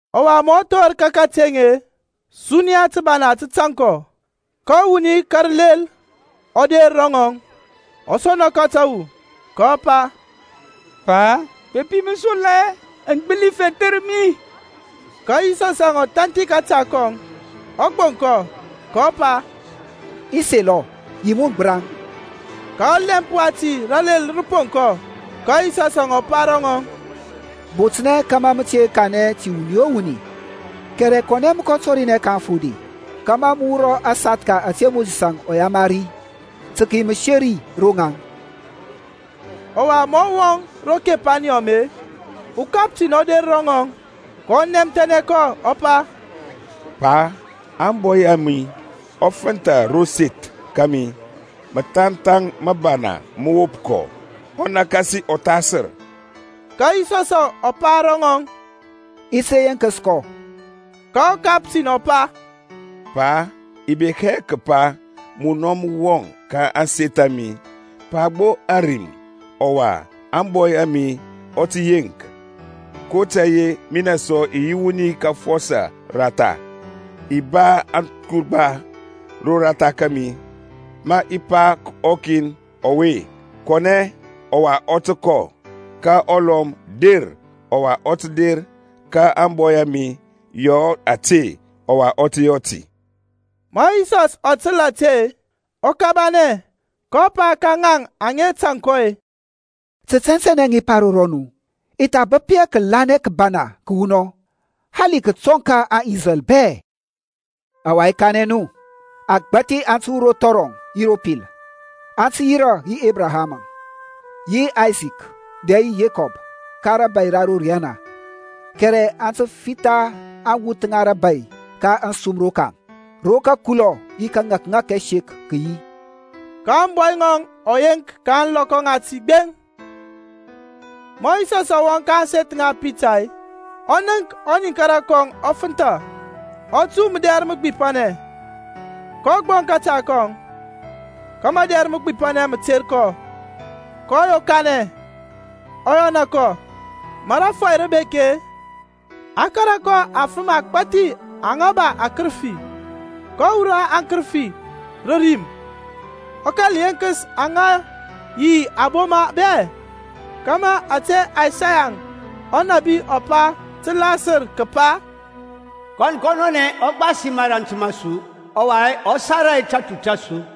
Ɔwa ma ɔ thor ka kateŋ-e, suniya tǝbana tǝ tan kɔ. Ka wuni ka rǝlel ɔ der ro ŋɔŋ, ɔ sɔna kɔ tǝwu, kɔ pa, Pa, bepi mǝ selɔ-e, mǝ gbǝli fethǝr mi. Ka Yisɔsȧŋ ɔ thanthi kȧta kɔŋ, ɔ gboŋ kɔ, kɔ pa, I selɔ. Yi mun gbǝraŋ. Ka ɔlɛmp wati ralel rǝ pond kɔ. Ka Yisɔsȧŋ ɔ pa ro rɔŋɔŋ, Botnɛ kȧmȧ mǝ te kanɛ ti wuni o wuni, kɛrɛ kɔnɛ mǝ tɔrinɛ ka aŋfode, kȧmȧ mǝ wurɔ asathka ȧte Mosisȧŋ ɔ yamari tǝ kǝyi mǝseri ro ŋaŋ. Ɔwa ma ɔ wɔŋ ro Kapǝrneɔm-e, ukaptin ɔ der ro ŋɔŋ, kɔ nɛmthɛnɛ kɔ, ɔ pa, Pa, ȧŋbɔy a mi ɔ fǝntha ro seth kȧmi, ɔ po gbɛthkɛ, ɔwa ɔ nakasi ɔthasǝr. Ka Yisɔsȧŋ ɔ pa ro ŋɔŋ, I ti der yeŋkǝs kɔ. Ka ɔkaptin ɔ pa, Pa, i bek hɛ kǝpa munɔ mǝ wɔŋ ka ȧŋseth a mi. Pa gbo ȧrim, ɔwa ȧŋbɔy a mi ɔ tǝ yeŋk. kotȧy-e minɛ sɔ i yi wuni ka afɔsɔ ratha, i ba aturgba roratha kȧmi. Ma i pa ka ɔkin ɔwe, Kɔnɛ, ɔwa ɔ tǝ kɔ. Ka ɔlɔm, Der, ɔwa ɔ tǝ der. Ka ȧŋbɔy a mi, Yɔ ȧte, ɔwa ɔ tǝ yɔ ti. Ma Yisɔs ɔ tǝl ȧte, ɔ kabanɛ, kɔ pa ka ŋaŋ aŋa tȧŋ kɔ-e, Tǝ tɛntɛnɛ i pa ro rɔnu, i tha bǝp hɛ kǝlanɛ kǝbana kǝwunɔŋ, hali kǝtɔŋ ka aŋIsrɛl bɛ. Ɔwa i kanɛ nu, agbȧthi aŋ tǝ wur ro thɔrɔŋ yi ro pil, aŋ tǝ yirȧ yi Ebraham, yi Aysak dɛ yi Yekɔb ka rȧbȧy ra ro riyana, kɛrɛ a tǝ fitha aŋwuth ŋa rȧbȧy ka ȧŋsum rokaŋ, ro kǝkulɔ yi kȧŋȧkŋȧk ɛsek kǝ yi. Ka ȧŋbɔy ŋɔŋ ɔ yeŋk ka ȧŋlɔkɔ ŋati gbeŋ. Ma Yisɔsȧŋ ɔ wɔŋ ka ȧŋseth ŋa Pitar-e, ɔ nənk ɔniŋkara kɔŋ ɔ fǝntha, ɔ tu mǝdɛr mǝgbipanɛ. kɔ gboŋ kȧta kɔŋ, ka madɛr mǝgbipanɛ mǝ ter kɔ, kɔ yokanɛ, ɔ yɔna kɔ. Ma rȧfɔy rǝ bek-e, a kȧrȧ kɔ afǝm agbȧthi aŋa ba akǝrǝfi. Kɔ wurɔ aŋkǝrǝfi rǝ rim, ɔ kȧl yeŋkǝs aŋa yi aboma bɛ; kȧmȧ ȧte Isaya ɔnȧbi ɔ pa tǝ lasǝr, kǝpa, Kɔn kɔnɔnɛ ɔ gbasi mȧrȧnt ma su, ɔwa ɔ sara tatu ta su.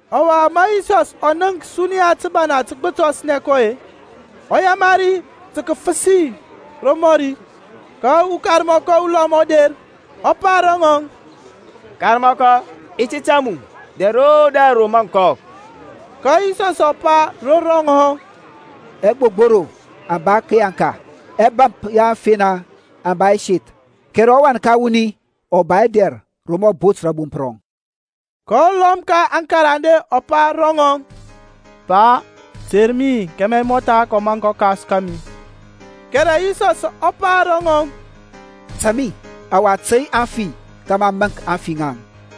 Ɔwa, ma Yisɔs ɔ nənk suniya tǝbana tǝ gbǝtɔsnɛ kɔ-e, ɔ yamari tǝ kǝfǝsi romɔri. Ka ukarmɔkɔ ulɔm ɔ der, ɔ pa ro ŋɔŋ, Karmɔkɔ i ti tȧŋ mu dɛr o dɛr ro maŋ kɔ. Ka Yisɔsȧŋ ɔ pa ro rɔŋɔŋ hɔ, Ɛgbogboro aŋ ba tǝyaŋka-e, ɛbȧmp ya aŋfena aŋ ba ɛseth. Kɛrɛ ɔWan ka wuni ɔ ba hɛ dɛr ro mǝ ɔ bot rȧbomp rɔŋ. Ka ulɔm ka aŋkarande ɔ pa ro ŋɔŋ, Pa, ter mi kȧmȧ i mɔtha kɔ maŋk ɔkas kȧmi. Kɛrɛ Yisɔs ɔ pa ro ŋɔŋ, Tȧŋ mi, ɔwa tey aŋfi kȧmȧ aŋ kɔ maŋk aŋfi ŋaŋ.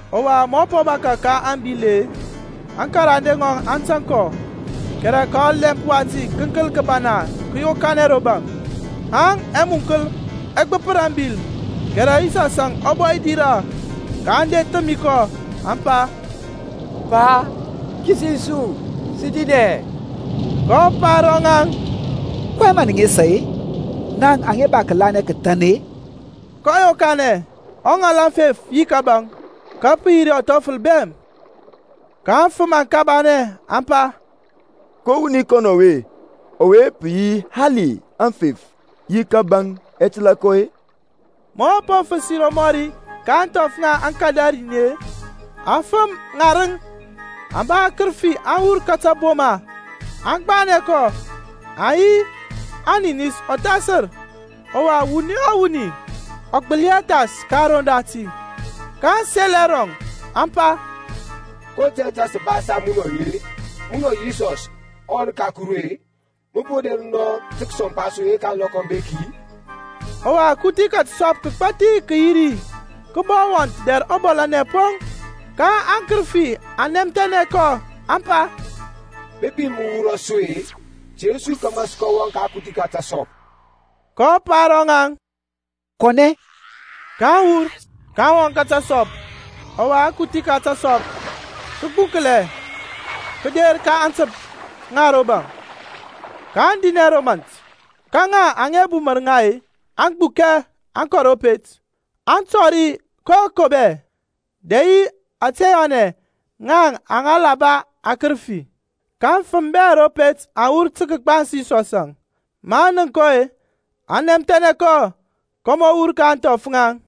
Ɔwa ma ɔ po bȧkȧ rǝ abil-e, aŋkarande ŋɔŋ aŋ tȧŋ kɔ. Kɛrɛ ka ɔlɛmp wati kǝnkǝl kǝbana kǝ yokanɛ ro baŋ, haŋ ɛmuŋkǝl ɛ gbǝpǝr ȧŋbil: kɛrɛ Yisɔsȧŋ ɔ bɔ dirȧ. kaŋ kɔ thǝmi kɔ, aŋ pa, Pa, kisis su, sǝ dinɛ. Kɔ pa ro ŋaŋ, kɔyɛŋ mǝ nǝ nesa-e, naŋ aŋa ba kǝlanɛ kǝthan-e? Kɔ yokanɛ, ɔ ŋal aŋfef yi kȧbȧŋ. Ka pǝ re yi ɔthɔfǝl bɛm. Ka aŋfǝm aŋ kabanɛ, aŋ pa, Ko wuni wɔŋ ɔwe-e, ɔwe pǝ yi hali aŋfef yi kȧbȧŋ aŋ tǝla kɔ-e? Ma ɔ po fǝsi romɔri ka ȧŋthɔf ŋa aŋKadarin-e, afǝm ŋarǝŋ aŋa ba akǝrǝfi aŋ wur ka taboma, aŋ gbanɛ kɔ. Aŋ yi aninis ɔthasǝr, ɔwa wuni o wuni ɔ gbǝli hɛ thas ka aroŋ dati. kaŋ sel ɛrɔŋ, aŋ pa, Ko tȧy tȧŋ saŋ sǝ ba yi munɔȧŋ-e, munɔ Yisɔs ɔWan ka Kuru-e? Mǝ po der nɔ tǝ kǝsɔmpa su yeŋka ȧŋlɔkɔ aŋ bek-i? Ɔwa kuthi ka tǝsɔp agbȧthi kǝ yi ri, kǝ bɔ wɔnth dɛr ɔbɔlanɛ poŋ. Ka aŋkǝrǝfi aŋ nɛmthɛnɛ kɔ aŋ pa, Bepi mǝ wurɔ su-e, ter su kȧmȧ sǝ kɔ wɔŋ ka akuthi ka tǝsɔp. kɔ pa ro ŋaŋ, Kɔnɛ. Kaŋ wur, kaŋ wɔŋ ka tǝsɔp. Ɔwa akuthi ka tǝsop kǝ gbuŋklɛ kǝder ka aŋtǝmp ŋa ro baŋ, kaŋ dinɛ ro mȧnt. Ka ŋa aŋa bumǝr ŋa-e aŋ gbukɛ aŋ kɔ ro pet, aŋ tɔri koko bɛ, dɛ yi ȧte yɔnɛ ŋaŋ aŋa la ba aŋkǝrǝfi. Ka aŋfǝm bɛ ro pet aŋ wur tǝ kǝgbans Yisɔsȧŋ. Maŋ nənk kɔ-e, aŋ nɛmthɛnɛ kɔ kȧmȧ ɔ wur ka ȧŋthɔf ŋaŋ.